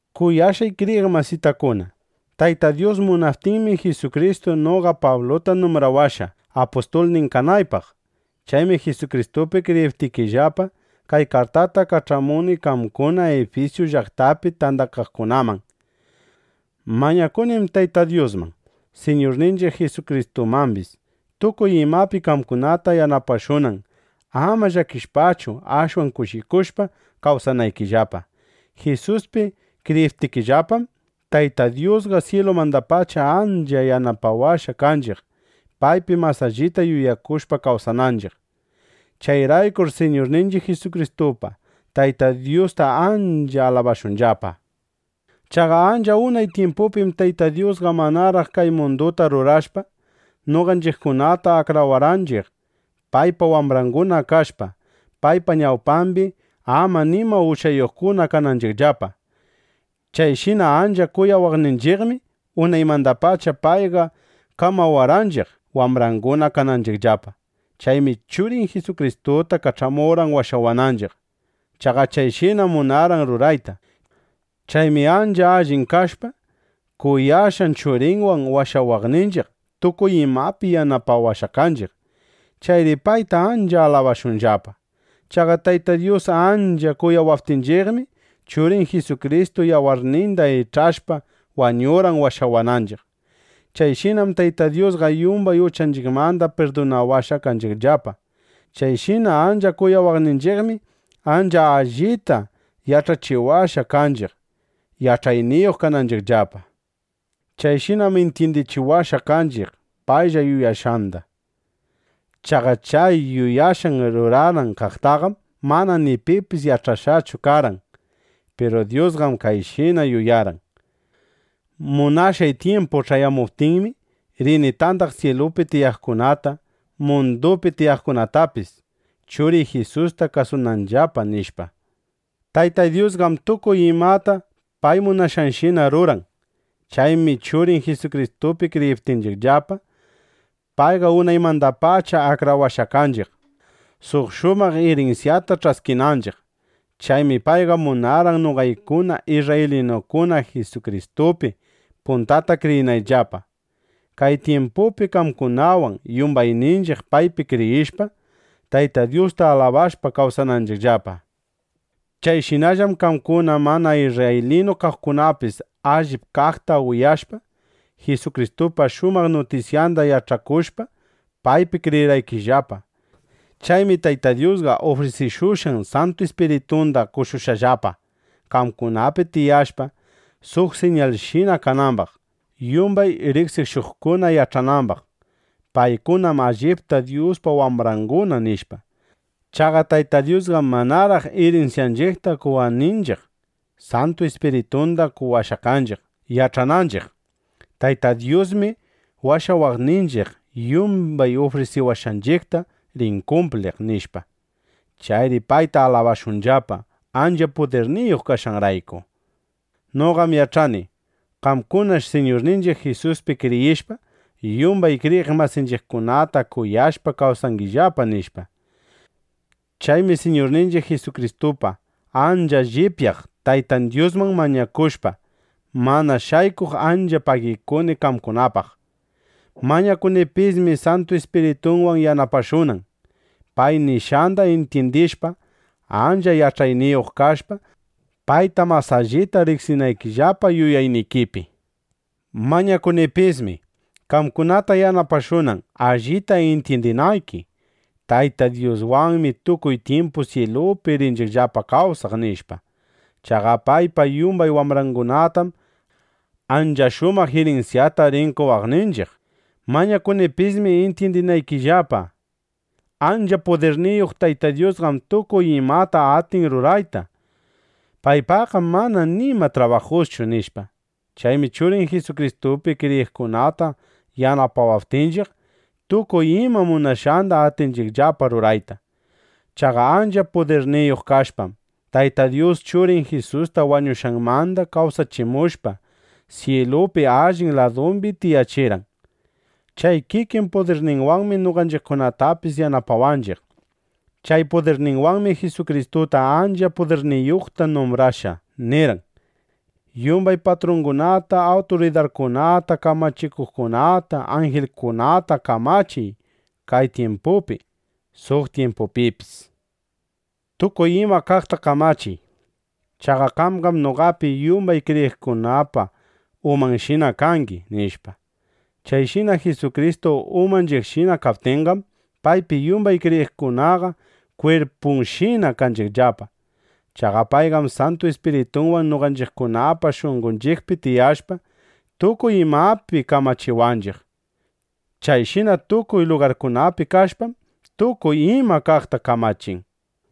Kuyashqay kriyiq masitakuna, Tayta Dyus munaptinmi, Jisukristu noqa Pabluta numbrawashqa, apustulnin kanaypaq. Chaymi Jisukristupi kriyiptikillapa, kay kartata kach'amuni qamkuna Ifisu llaqtapi tandakaqkunaman. Mañakunim Tayta Dyusman, Siñurninchiq Jisukristumambis, tukuy imapi qamkunata yanapashunan, ama llakishpachu ashwan kushikushpa kawsanaykillapa. Jisuspi kriyiptinchiqllapam, Tayta Dyusqa syilumandapacha ancha yanapawashqa kanchiq, paypi mas allita yuyakushpa kawsananchiq. ¡Chayraykur Siñurninchiq Jisukristupa Tayta Dyusta ancha alabashunllapa! Chaqa ancha unay tyimpupim Tayta Dyusqa manaraq kay munduta rurashpa, noqanchiqkunata akrawarqanchiq, paypa wambranguna kashpa, paypa ñawpambi ama nima uchayuqkuna kananchiqllapa. Chayshina ancha kuyawaqninchiqmi, unaymandapacha payqa kamawarqanchiq, wambranguna kananchiqllapa. Chaymi Churin Jisukristuta kach'amurqan washawananchiq. Chaqa chayshinam munarqan rurayta. Chaymi ancha allin kashpa, kuyashqan Churinwan washawaqninchiq, tukuy imapi yanapawashqa kanchiq. ¡Chayri payta ancha alabashunllapa! Chaqa Tayta Dyus ancha kuyawaptinchiqmi, Churin Jisukristu yawarninda ich'ashpa wañurqan washawananchiq. Chayshinam Tayta Dyusqa yumbay uchanchiqmanda pirdunawashqa kanchiqllapa. Chayshina ancha kuyawaqninchiqmi, ancha allita yach'achiwashqa kanchiq, yach'ayniyuq kananchiqllapa. Chayshinam intyindichiwashqa kanchiq paylla yuyashqanda. Chaqa chay yuyashqan ruranan kaqtaqam mana pipis yach'ashqachu karqan. Piru Dyusqam kayshina yuyarqan: Munashqay tyimpu ch'ayamuptinmi, rini tandaq syilupi tiyaqkunata, mundupi tiyaqkunatapis, Churiy Jisusta kasunanllapa, nishpa. Tayta Dyusqam tukuy imata pay munashqanshina ruran. Chaymi Churin Jisukristupi kriyiptinchiqllapa, payqa unaymandapacha akrawashqa kanchiq, suq shumaq irinsyata ch'askinanchiq. Chaymi payqa munarqan noqaykuna isrraylinukuna Jisukristupi puntata kriyinayllapa, kay tyimpupi qamkunawan yumbayninchiq paypi kriyishpa, Tayta Dyusta alabashpa kawsananchiqllapa. Chayshinallam qamkuna mana isrraylinu kaqkunapis allip kaqta uyashpa, Jisukristupa shumaq nutisyanda yach'akushpa, paypi kriyirqaykillapa. Chaymi Tayta Dyusqa ufrisikushqan Santu Ispiritunda qoshushqallapa, qamkunapi tiyashpa, suq siñalshina kanambaq, yumbay riqsishuqkuna yach'anambaq: Paykunam allipta Dyuspa wambranguna, nishpa. Chaqa Tayta Dyusqam manaraq irinsyanchiqta qowaqninchiq, Santu Ispiritunda qowashqa kanchiq, yach'ananchiq: Tayta Dyusmi washawaqninchiq, yumbay ufrisiwashqanchiqta rin kumpliq, nishpa. Chayri payta alabashunllapa, ancha pudirniyuq kashqanrayku. Noqam yach'ani: qamkunash Siñurninchiq Jisuspi kriyishpa, yumbay kriyiq masinchiqkunata kuyashpa, kawsangillapa, nishpa. Chaymi Siñurninchiq Jisukristupa ancha llipyaq Taytan Dyusman mañakushpa, mana shaykuq ancha pagikuni qamkunapaq. Mañakunipismi Santu Ispiritunwan yanapashunan, pay nishqanda intyindishpa, ancha yach'ayniyuq kashpa, payta mas allita riqsinaykillapa yuyaynikipi. Mañakunipismi, qamkunata yanapashunan, allita intyindinayki: Tayta Dyuswanmi tukuy tyimpu syilupi rinchiqllapa kawsaq, nishpa. Chaqa paypa yumbay wambrangunatam ancha shumaq irinsyata rin qowaqninchiq. Mañakunipismi intyindinaykillapa: Ancha pudirniyuq Tayta Dyusqam tukuy imata atin rurayta. Paypaqqam mana nima trabajuschu, nishpa. Chaymi Churin Jisukristupi kriyiqkunata yanapawaptinchiq, tukuy ima munashqanda atinchiqllapa rurayta. Chaqa ancha pudirniyuq kashpam, Tayta Dyus Churin Jisusta wañushqanmanda kawsachimushpa, syilupi allin ladumbi tiyachirqan. Chay kikin pudirninwanmi noqanchiqkunatapis yanapawanchiq. Chay pudirninwanmi Jisukristuta ancha pudirniyuqta numbrashpa, nirqan: “Yumbay patrungunata, awturidarkunata, kamachikuqkunata, anjilkunata kamachiy kay tyimpupi, suq tyimpupipis. Tukuy ima kaqta kamachiy. Chaqa qamqam noqapi yumbay kriyiqkunapa umanshina kangi”, nishpa. Chayshina Jisukristu umanchiqshina kaptinqam, paypi yumbay kriyiqkunaqa kwirpunshina kanchiqllapa. Chaqa payqam Santu Ispiritunwan noqanchiqkunapa shunqonchiqpi tiyashpa, tukuy imapi kamachiwanchiq. Chayshina tukuy lugarkunapi kashpam, tukuy ima kaqta kamachin.